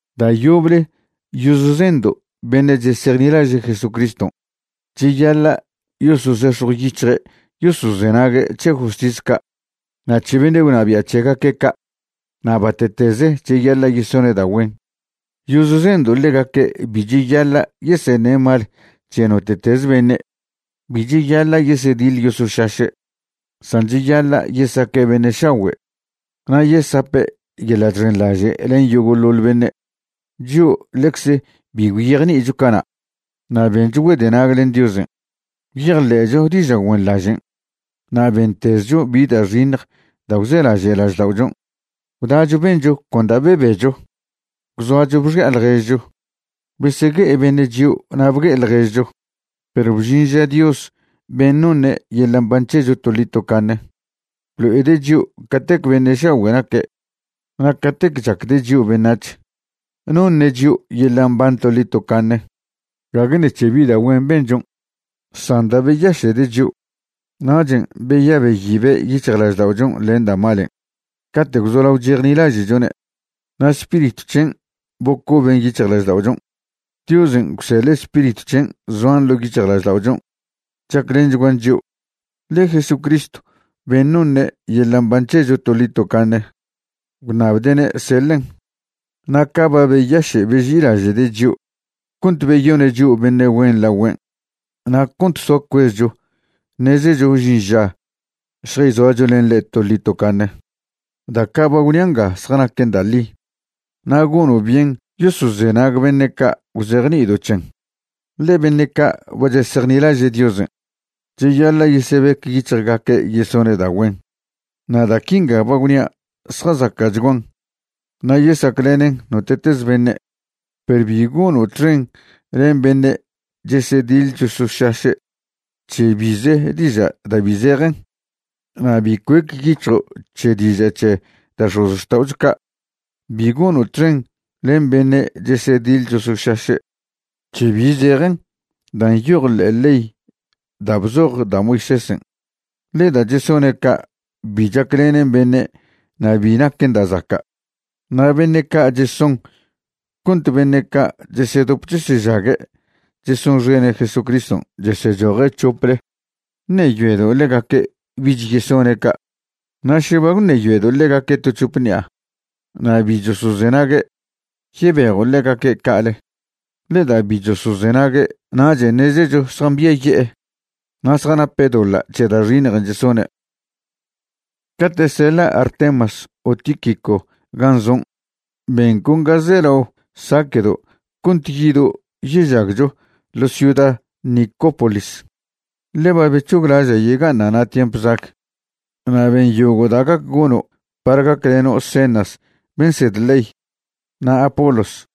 Da' yoble yozzendo' beṉe' chesejnilaže' Jesucriston' cheyaḻa' yosozex̱jwyic̱hje' yosozenague' c̱he justis ca' na' c̱he beṉe' gwnabia' c̱hegaque' ca' na' bate'teze cheyaḻa' yesone' da' güen. Yozzendo' ḻegaque' bi cheyaḻa' yeseṉe' mal c̱he note'teze beṉe'. Bi cheyaḻa' yesediḻ yosošaše', san cheyaḻa' yesaque' beṉe' šagüe' na' yesape' yeḻa' chxenḻaže' len yogo'ḻoḻ beṉe'. Chio' ḻecze bi gwyejni'icho cana' na' bencho güedenag len Diosen'. Gwyejḻe'cho diža' güenḻažen' na' bentezcho bi da' xiṉj da' gwzelaže' lažda'ochon'. Gwdacho bencho con da' bebecho. Gwzoacho bxi'a ḻježcho. Besegue'e beṉe' chio' na' bgue'e ḻježcho. Perw bžin ža Dios ben' noṉe' yeḻa' mban c̱hecho toḻi tocaṉe blo'ede' chio' catec beṉe' šagüe' naque' na' catec chacde' chio' beṉac̱h. Noṉe' chio' yeḻa' mban toḻi tocaṉe gague ṉec̱he bi da' güen benchon', san da' beyaše'de' chio'. Nachen' beya' beyibe' yic̱hjlažda'ochon' len da' malen' cate' gwzolao chejnilaže'chone', na' Spiritw c̱hen' bocoben yic̱hjlažda'ochon'. Diosen' gwseḻe' Spiritw c̱hen' zoan ḻo' yic̱hjlažda'ochon' chaclenchguan chio', ḻe Jesucristw ben' noṉe' yeḻa' mban c̱hecho toḻi tocaṉe gwṉabde'ne' seḻen'. Na' ca' ba beyaše' beži'ilaže'de' chio' cont beyone' chio' beṉe' güen lagüen' na' cont soa cuezcho ṉezecho žin ža šjayzoacho len ḻe' toḻi tocaṉe. Da' ca' ba gwnia' nga zjanaquen da' ḻi, na' gono' byen yosozenag beṉe' ca' gwzejni'ido' c̱hen. Ḻe beṉe' ca' ba chesejnilaže' Diosen' cheyaḻa' yesebec yic̱hjgaque' yesone' da' güen. Na' da' quinga ba gwnia' zjazaca'chguan na' yesaclenen note'teze beṉe'. Perw bi gono' txen len beṉe' chesediḻ chosošaše' c̱he bize diža' da' bi zejen. Na' bi cuec yic̱hjo' c̱he diaža c̱he da' x̱ozxta'ocho ca'. Bi gono' txen len beṉe' chesediḻ chosošaše' c̱he bi zejen dan' nyoj ḻe'e ḻey da' bzoj da' Moisésen', ḻe da' chesone' ca' bi chaclenen beṉe' na' bi naquen da' zaca'. Na' beṉe' ca' cheson cont beṉe' ca' chesedop chesežague' chesonxene' Jesucriston' chesechoje' c̱hople, ṉeyoedo' ḻegaque' bich yesone' ca'. Na' še ba gwṉeyoedo' ḻegaque' to c̱hope ṉi'a na' bi chosozenague', yebejo' ḻegaque' ca'ale. Ḻe da' bi chosozenague' nachen' ṉezecho zjambiaye'e na' zjanape' doḻa' c̱he da' xiṉjen' chesone'. Cate' seḻa' Artemas o Tíquico gan' zon', ben con ga zelao saque'do' cont yido' yežagcho ḻo' ciuda Nicópolis, ḻe ba bec̱hoglaža' yega'aṉa' na' tiemp zag. Na' ben yogo' da' gac gono' par gacleno' Zenas ben' nsed ley, na' Apolos,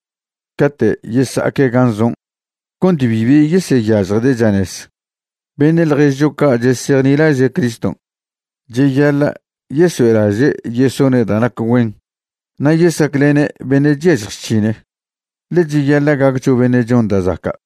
cate' yesa'aque' gan' zon' cont bibi yeseyažjde' chanez. Beṉe' ḻježcho ca' chesejnilaže' Criston' cheyaḻa' yesoe'laže' yesone' da' nac güen na' yesaclene' beṉe' chyažj chc̱hine. Ḻe cheyaḻa' gaccho beṉe' chon da' zaca'.